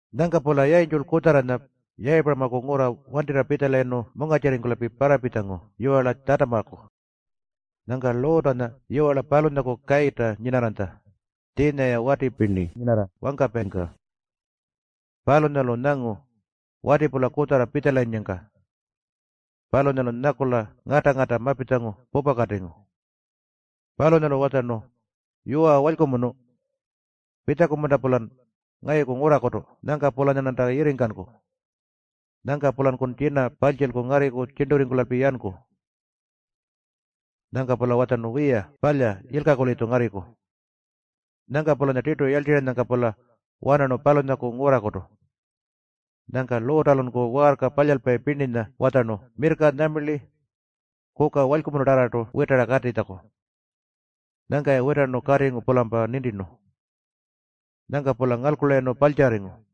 Nyangka-pula yayintjulpa kutjarranya Yayipuramaku ngurra wantirra pitjalayirnu mungarrtjirringkula parrapitjangu yiwarla Tjatamaku. Nyangka Luutanya yiwarla palunyaku kayirrta nyinarranytja, tjiinya-ya wati pirni nyinarra wangkapayingka. Palunyalu nyangu wati-pula kutjarra pitjalayinnyangka. Palunyalu nyakula ngata-ngata mapitjangu pupakatingu. Palunyalu watjarnu, “Yuwa, walykumunu. Pitjaku-munta-pulan ngayuku ngurrakutu nyangka-pulanyarnanta yirringkanku? Nyangka-pulankun tjina parltjilku ngarriku tjirnturringkula yanku.” Nyangka-pula watjarnu, “Wiya palya, yilkaku-litju ngarriku.” Nyangka-pulanya tirtu yarltirranyangka-pula wanarnu palunyaku ngurrakutu. Nyangka Luutalunku waarka palyalpayi pirninya watjarnu mirrka nyuma, kuka walykumunutarrartu witara katitjaku. Nyangka-ya witarnu katingu-pulampa nintirnu. Nyangka-pula ngalkulayirnu parltjarringu.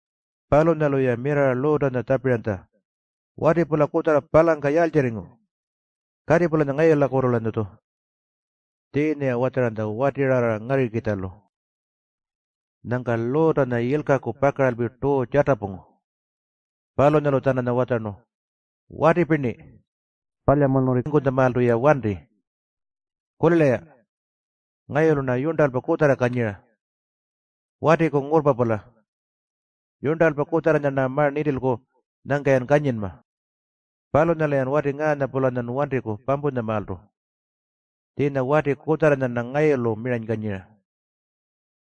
Palunyalu-ya mirrarra Luutanya tjapiranytja, “Wati-pula kutjarra palangka yaaltjirringu? Kati-pulanya ngayulakutu-lanyatju.” Tjiinya-ya watjaranytja watirarra ngarrikitjalu. Nyangka Luutanya yilkaku pakaralpi tuu tjatapungu. Palunyalu-tjananya watjarnu, “Wati pirni, palyamunurringkutjamaaltu-ya wanti. Kulila-ya. Ngayulu-rna yurntalpa kutjarra kanyira. Watiku ngurrpa-pula. Yurntalpa kutjarranya-rna ma-nintilku nyangka-yan kanyinma. Palunyalu-yan wati ngaanya-pulanya wantiku pampuntjamaaltu. Tjiinya wati kutjarra-rna ngayulu miranykanyira.”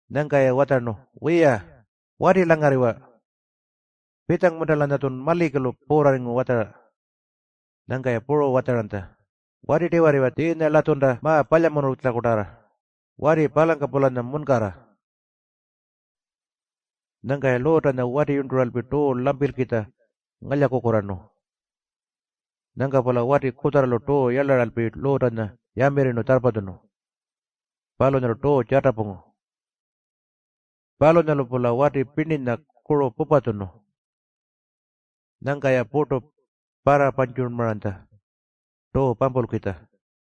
Nyangka-ya watjarnu, “Wiya, wati-langarriwa. Pitjangu-munta-lanyatjun malikilu puurrarringu watjara?” Nyangka-ya puru watjaranytja, “Wati-tiwarriwa tjiinya-latjunta ma-palyamunultjakutarra, wati palangka-pulanya munkarra.” Nyangka-ya Luutanya watiyurnturalpi tuu lampilkitja ngalyakukurraarnu. Nyangka-pula wati kutjarralu tuu yarlaralpi Luutanya yamirrinu tjarrpatjunu. Palunyalu tuu tjatapungu. Palunyalu-pula wati pirninya kuru pupatjunu. Nyangka-ya purtu parrapantjurrmaranytja tuu pampulkitja.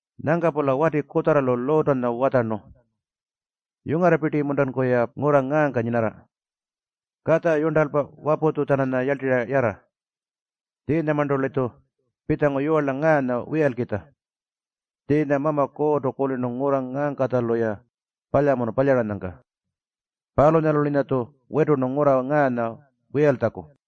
Nyangka-pula wati kutjarralu Luutanya watjarnu, “Yungarrapirti-muntanku-ya ngurra ngaangka nyinarra? Katja, yurntalpa, waputju-tjananya yarltirra yarra. Tjiinyamarntu-litju pitjangu yiwarla ngaanya wiyalkitja. Tjiinya Mama Kuurrtu kulirnu ngurra ngaangkatjalu-ya palyamunu palyaranyangka. Palunyalu-linyatju witurnu ngurra ngaanya wiyaltjaku.”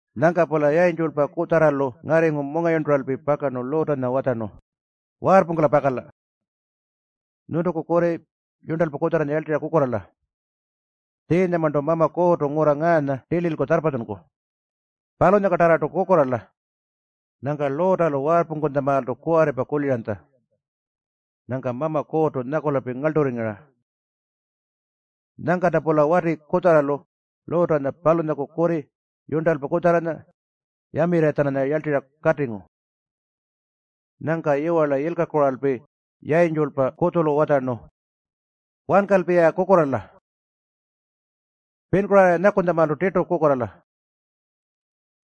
Nyangka-pula yayintjulpa kutjarralu ngarringu mungayurnturalpi pakarnu Luutanya watjarnu, “Waarrpungkula pakala! Nyuntuku kurri, yurntalpa kutjarranya yarltirra kukurraala. Tjiinyamarntu Mama Kuurrtu ngurra ngaanya tililku tjarrpatjunku. Palunyangkatarrartu kukurraala!” Nyangka Luutalu waarrpungkutjamaaltu kuwarripa kuliranytja. Nyangka Mama Kuurrtu nyakulalpi ngarlturringu-ra. Nyangkalta-pula wati kutjarralu Luutanya, palunyaku kurri puru yurntalpa kutjarranya yamirrira-tjananya yarltirra katingu. Nyangka yiwarla yilkakuralpi yayintjulpa kutjulu watjarnu, “Wankalpi-ya kukurraala. Pinkurraara-ya nyakunytjamaalpa tirtu kukurraala.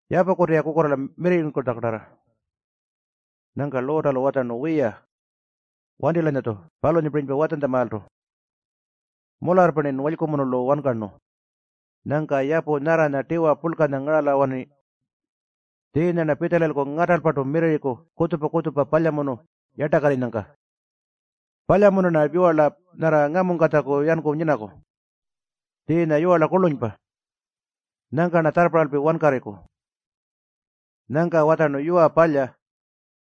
Yapukutu-ya kukurraala mirrirritjakutarra.” Nyangka Luutalu watjarnu, “Wiya, wanti-lanyatju palunyapirinypa watjantjamaaltu. Mularrpa-rnin walykumunulu wankarnu. Nyangka yapu nyarranya tiwa purlkanya ngarala-wanarayirni. Tjiinya-rna pitjalayilku ngatalpartu mirrirriku kutjupa-kutjupa palyamunu yartakarrinyangka. Palya-munta-rna yiwarla nyarra ngamungkatjaku yanku nyinaku? Tjiinya yiwarla kurlunypa. Nyangka-rna tjarrparralpi wankarriku.” Nyangka watjarnu, “Yuwa, palya.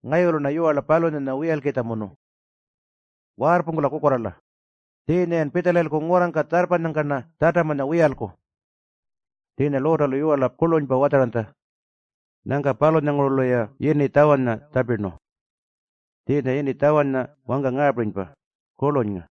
Ngayulu-rna yiwarla palunyanya wiyalkitjamunu. Waarrpungkula kukurraala. Tjiinya-yan pitjalayilku ngurrangka tjarrpanyangka-rna Tjatamanya wiyalku.” Tjiinya Luutalu yiwarla kurlunypa watjaranytja. Nyangka palunyangurulu-ya yini Tjawanya tjapirnu. Tjiinya yini Tjawanya wangka ngaapirinypa, Kurlunynga.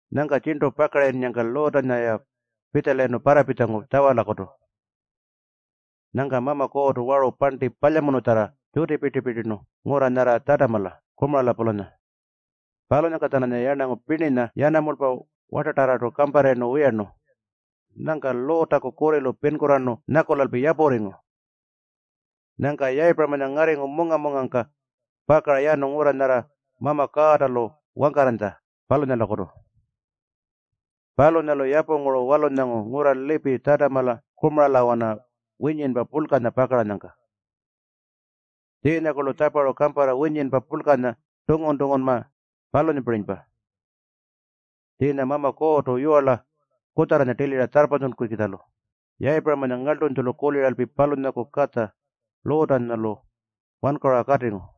Nyangka tjirntu pakarayinnyangka Luutanya-ya pitjalayirnu parrapitjangu Tjawalakutu. Nyangka Mama Kuurrtu waru parnti palyamunutjarra tjutipirti-pirtirnu ngurra nyarra Tjatamala Kumarala-pulanya. Palunyangka-tjananya yarnangu pirninya, yanamulpa puru wartatarrartu kamparrayirnu wiyarnu. Nyangka Luutaku kurrilu pinkurraarnu nyakulalpi yapurringu. Nyangka Yayipuramanya ngarringu munga-mungangka pakara yanu ngurra nyarra Mama Kuurrta-lu wangkarranytja, palunyalakutu. Palunyalu yapunguru walunyangu ngurra lipi Tjatamala Kumaralawana winyinpa purlkanya pakaranyangka. Tjiinyakurlu tjaparu kamparra winyinpa purlkanya tunngu-tunngunma, palunyapirinypa. Tjiinya Mama Kuurrtu yiwarla kutjarranya tilira tjarrpatjunkukitjalu Yayipuramanya ngarltunytjulu kuliralpi palunyaku katja Luutanya-lu wankarura katingu.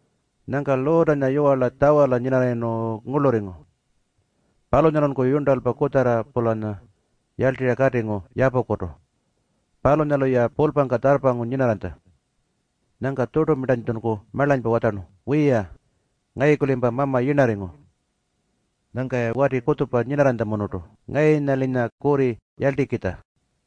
Nyangka Luutanya yiwarla Tjawala nyinarrayirnu ngurlurringu. Palunyalunku yurntalpa kutjarra-pulanya yarltirra katingu yapukutu. Palunyalu-ya pulpangka tjarrpangu nyinarranytja. Nyangka tjurtulunku marlanypa watjarnu, “Wiya, ngayuku-limpa mama yirnarringu. Nyangka-ya wati kutjupa nyinanytjamunurtu ngayunya-linya kurri yarltikitja.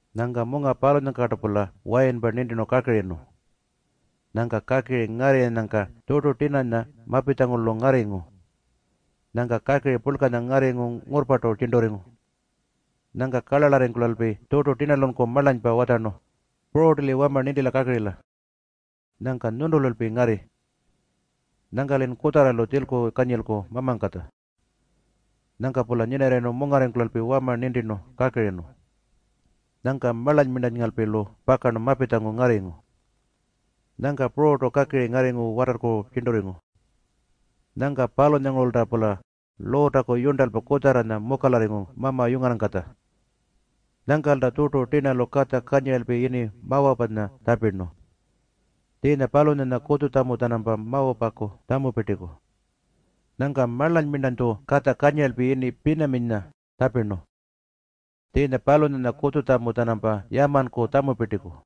Nyangka munga palunyangkartu-pula wayinpa nintirnu kakirinu. Nyangka kakiri ngarrirranyangka tjurtu tirnanya mapitjangu-lu ngarringu. Nyangka kakiri purlkanya ngarringu ngurrpartu tjirnturringu. Nyangka karlarlarringkulalpi tjurtu tirnalunku marlanypa watjarnu, “Pururtu-li wama nintila kakirila. Nyangka nyuntululpi ngarri. Nyangka-lin kutjarralu tjilku kanyilku mamangkatja.” Nyangka-pula nyinarrayirnu mungarringkulalpi wama nintirnu kakirinu. Nyangka marlanyngalpi-lu pakarnu mapitjangu ngarringu. Nyangka pururtu kakiri ngarringu watarrku tjirnturringu. Nyangka palunyangurulta-pula Luutaku yurntalpa kutjarranya mukalarringu mama yungarrangkatja. Nyangkalta tjurtu tirnalu katja kanyiralpi yini Mawapanya tjapirnu. Tjiinya palunyanya kutjutjamu-tjanampa Mawapaku tjamupirtiku. Nyangka marlanytju katja kanyiralpi yini Pinaminya tjapirnu. Tjiinya palunyanya kutjutjamu-tjanampa Yamanku tjamupirtiku.